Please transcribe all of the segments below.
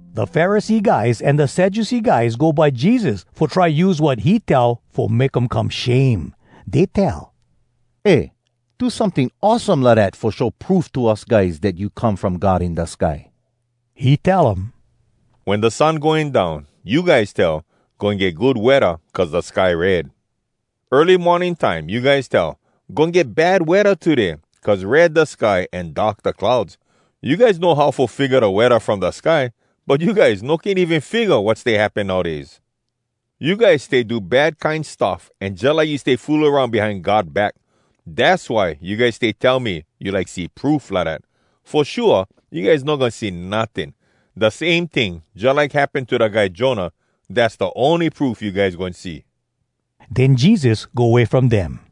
Da Pharisee guys an da Sadducee guys go by Jesus fo try use wat he tell fo make um come shame. Dey tell, “Eh! Do someting awesome lidat fo show proof to us guys dat you come from God in da sky.” He tell um, “Wen da sun going down, you guys tell, ‘Goin get good weather cuz da sky red.’ Early morning time, you guys tell, ‘Goin get bad weather today cuz red da sky an dark da clouds.’ You guys know how fo figga da weather from da sky, but you guys no can even figga wat stay happen nowdays. You guys stay do bad kine stuff, an jalike you stay fool aroun behind God back. Dass why you guys stay tell me you like see proof lidat. Fo shua, you guys no goin see notting. Da same ting jalike happen to da guy Jonah, dass da ony proof you guys goin see!” Den Jesus go way from dem.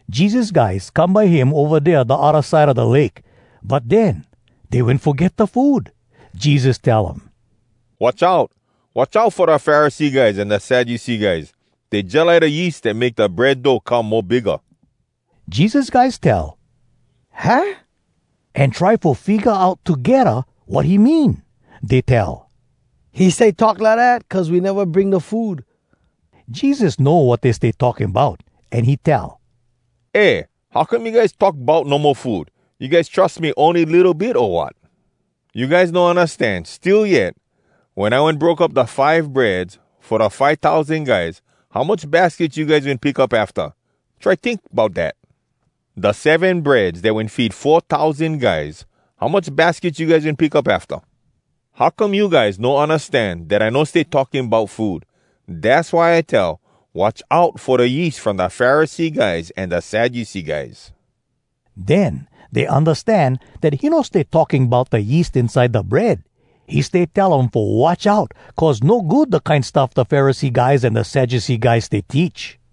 Jesus guys come by him ova dea da odda side a da lake. But den dey wen foget da food. Jesus tell um, “Watch out! Watch out fo da Pharisee guys an da Sadducee guys! Dey jalike da yeast dat make da bread dough come mo bigga.” Jesus guys tell “Hah?” an try fo figga out togedda wat he mean. Dey tell, “He stay talk lidat cuz we neva bring da food.” Jesus know wat dey stay talking bout, an he tell, “Eh! How come you guys talk bout no mo food? You guys trus me ony litto bit, o wat? You guys no undastan, still yet? Wen I wen broke up da five breads fo da five tousan guys, how much baskets you guys wen pick up afta? Try tink bout dat. Da seven breads dat wen feed four tousan guys, how much baskets you guys wen pick up afta? How come you guys no undastan dat I no stay talking bout food? Dass why I tell, watch out fo da yeast from da Pharisee guys an da Sadducee guys.” Den dey undastan dat he no stay talking bout da yeast inside da bread. He stay tell um fo watch out cuz no good da kine stuff da Pharisee guys an da Sadducee guys stay teach.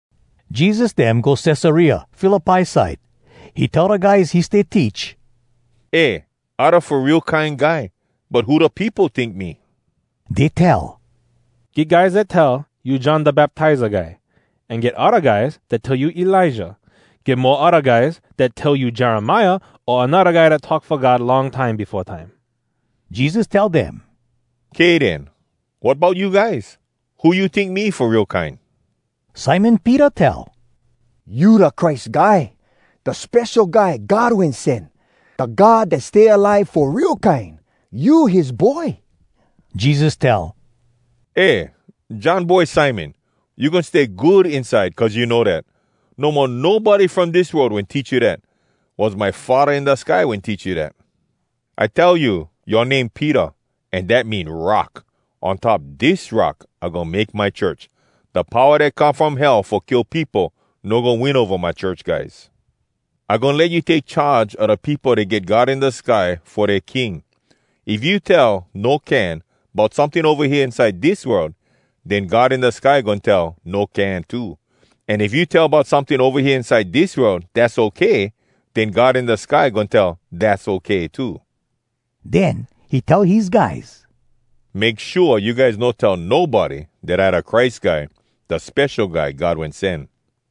Jesus dem go Cesarea Philippi side. He tell da guys he stay teach, “Eh, I da Fo Real Kine Guy, but who da peopo tink me?” Dey tell, “Get guys dat tell you John Da Baptiza Guy. An get odda guys dat tell you Elijah. Get mo odda guys dat tell you Jeremiah, o anodda guy dat talk fo God long time befo time.” Jesus tell dem, “Kay den, wat bout you guys? Who you tink me fo real kine?” Simon Peter tell, “You da Christ Guy, da Spesho Guy God Wen Sen. Da God dat stay alive fo real kine, you his Boy.” Jesus tell, “Eh, John boy Simon! You goin stay good inside cuz you know dat. No mo nobody from dis world wen teach you dat. Was my Faddah in da sky wen teach you dat. I tell you, yoa name Peter, an dat mean ‘rock.’ On top dis rock I goin make my church. Da powa dat come from Hell fo kill peopo no goin win ova my church guys. I goin let you take charge a da peopo dat get God in da sky fo dea King. If you tell, ‘No can,’ bout someting ova hea inside dis world, den God in da sky goin tell, ‘No can,’ too. An if you tell bout someting ova hea inside dis world ‘Dass okay,’ den God in da sky goin tell ‘Dass okay,’ too.” Den he tell his guys, “Make shua you guys no tell nobody dat I da Christ Guy, da Spesho Guy God Wen Sen.”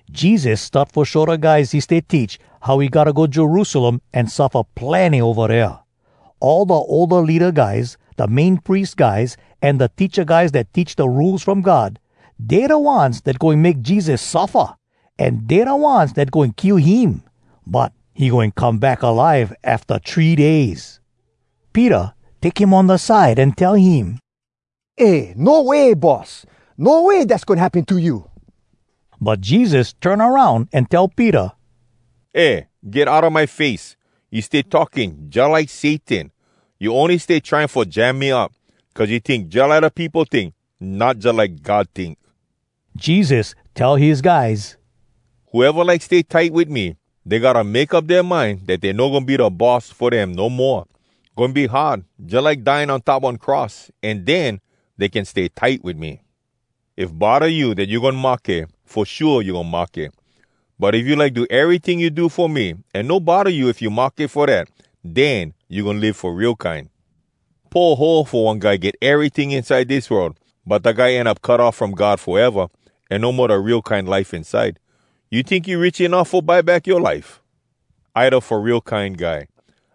Jesus start fo show da guys he stay teach how he gotta go Jerusalem an suffa plenny ova dea. All da older leada guys, da Main Pries guys, an da teacha guys dat teach da Rules From God, dey da ones dat goin make Jesus suffa, an dey da ones dat goin kill him. But he goin come back alive afta three days. Peter take him on da side an tell him, “Eh! No way, Boss! No way dass goin happen to you!” But Jesus turn aroun an tell Peter, “Eh, get outa my face! You stay talking jalike Satan! You ony stay trying fo jam me up. Cuz you tink jalike da peopo tink, not jalike God tink.” Jesus tell his guys, “Whoeva like stay tight wit me, dey gotta make up dea mind dat dey no goin be da boss fo dem no moa. Goin be hard, jalike dying on top one cross. An den, dey can stay tight wit me. If bodda you dat you goin mahke, fo shua you goin mahke. But if you like do eryting you do fo me, an no bodda you if you mahke fo dat, den you goin live fo real kine. Poho fo one guy get eryting inside dis world, but da guy end up cut off from God foeva, an no mo da real kine life inside. You tink you rich enuff fo buy back yoa life? I da Fo Real Kine Guy.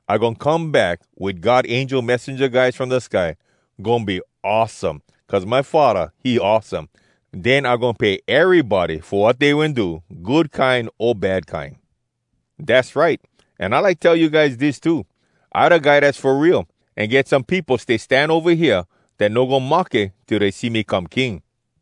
I goin come back wit God angel messenja guys from da sky. Goin be awesome, cuz my Faddah, he awesome. Den I goin pay erybody fo wat dey wen do, good kine o bad kine. Dass right! An I like tell you guys dis too: I da Guy Dass fo Real, an get some peopo stay stan ova hea, dat no goin mahke till dey see me come King.”